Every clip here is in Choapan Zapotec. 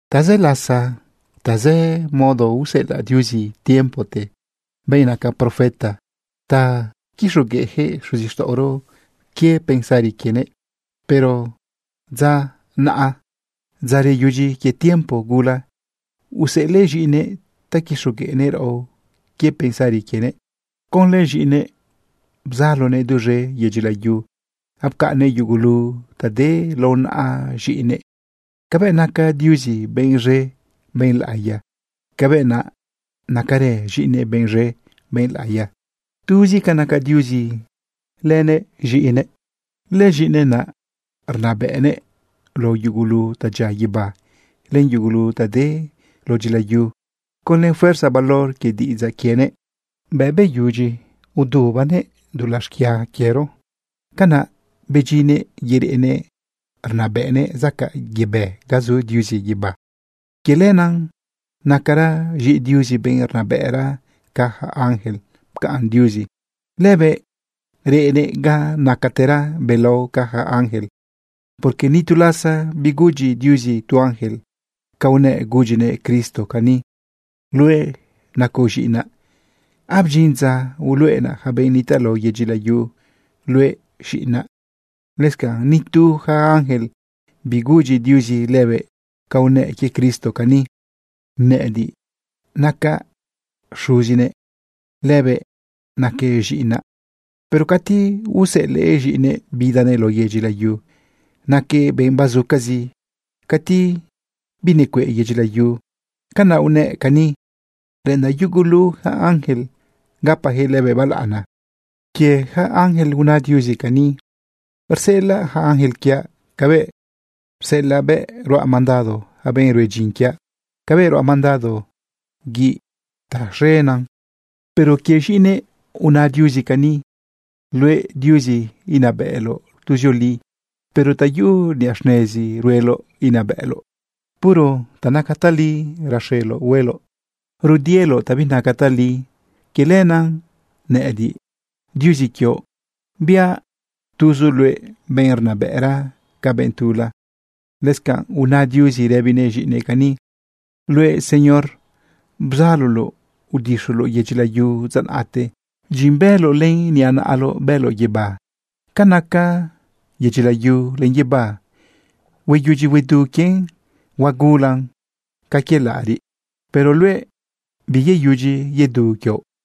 Tazë lasa, tazë modo, useꞌelaꞌ Diuzi tiempote benꞌ naca profeta ta quixogueꞌjëꞌ xuzixtaꞌoro quie pensari quienëꞌ. Pero dza naꞌa, dza reyudyi quie tiempo gula, useꞌelëꞌ z̃iꞌinëꞌ ta quixogueꞌnëꞌ raꞌo quie pensari quienëꞌ. Conlë z̃iꞌinëꞌ bzalonëꞌ duz̃e yedyi layu, apcaꞌnnëꞌ yugulu ta de lao naꞌa z̃iꞌinëꞌ. Cabëꞌ naca Diuzi benꞌ z̃e, benꞌ laꞌiya, cabëꞌ naꞌ nacarë z̃iꞌinëꞌ benꞌ z̃e, benꞌ laꞌiya. Tuzi ca naca Diuzi lënëꞌ z̃iꞌinëꞌ. Lëz̃iꞌinëꞌ naꞌ rnabëꞌnëꞌ lao yugulu ta dyia guibá len yugulu ta de lao dyilayu conlë fuerza valor quie diꞌidzaꞌ quienëꞌ. Bëꞌ beyudyi udubanëꞌ dulaꞌ xquia quiero, canaꞌ bedyinnëꞌ yereꞌnëꞌ rnabëꞌnëꞌ zacaꞌ yebë ga zu Diuzi guibá. Quie lenaꞌ nacara z̃iꞌi Diuzi benꞌ rnabëꞌra ca yaca ángel. Pcaꞌn Diuzi lëbëꞌ reꞌnëꞌ ga nacatera belao ca yaca ángel. Porque ni tu lasa bigudyi Diuzi tu ángel ca unëꞌ gudyinëꞌ Cristo cani: Luëꞌ nacoꞌ z̃iꞌinaꞌ. Abdyin dza uluꞌenaꞌ yaca benꞌ nitaꞌ lao yedyi layu luëꞌ z̃iꞌinaꞌ. Lëscanꞌ ni tu yaca ángel bigudyi Diuzi lëbëꞌ ca unëꞌ quie Cristo cani: Nëꞌëdiꞌ nacaꞌ Xuzinëꞌ. Lëbëꞌ naquëꞌ z̃iꞌinaꞌ. Pero cati useꞌelëꞌ z̃iꞌinëꞌ bidanëꞌ lao yedyi layu, naquëꞌ benꞌ bazucazi cati binecueꞌ yedyi layu, canaꞌ unëꞌ cani: Reꞌendaꞌ yugulu yaca ángel gapajëꞌ lëbëꞌ balaꞌana. Quie yaca ángel una Diuzi cani: Rseꞌelaꞌ ja ángel quiaꞌ cabëꞌ rseꞌelaꞌbe. Ruaꞌ mandado ja benꞌ rue dyin quiaꞌ cabëꞌ ruaꞌ mandado guiꞌ ta z̃enan. Pero quie z̃iꞌinëꞌ una Diuzi cani: Luëꞌ, Diuzi, inabëꞌloꞌ tuzioli. Puro ta yuꞌu niꞌa xnezi rueloꞌ inabëꞌloꞌ. Puro ta naca tali raxeloꞌ hueloꞌ. Rudieloꞌ ta binaca tali. Quie lenaꞌ nëꞌëdiꞌ, Diuzi quioꞌ, biaꞌ tuzoꞌ luëꞌ benꞌ rnabëꞌra ca benꞌ tula. Lëscanꞌ una Diuzi rëbinëꞌ z̃iꞌinëꞌ cani: Luëꞌ, Señor, bzaloloꞌ udixuloꞌ yedyi layu dza naꞌte. Dyin bëloꞌ len niꞌa naꞌaloꞌ bëloꞌ guibá. Ca naca yedyi layu len guibá, hueyudyi huedu quien, huagulan ca quie laꞌariꞌ. Pero luëꞌ, biyeyudyi yedu quioꞌ.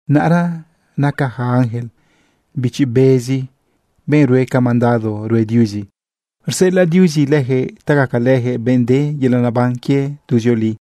Naꞌra naca yaca ángel bichi bezi, benꞌ rue ca mandado rue Diuzi. Rseꞌelaꞌ Diuzi lëjëꞌ ta gacalëjëꞌ benꞌ de yelaꞌ neban quie tuzioli.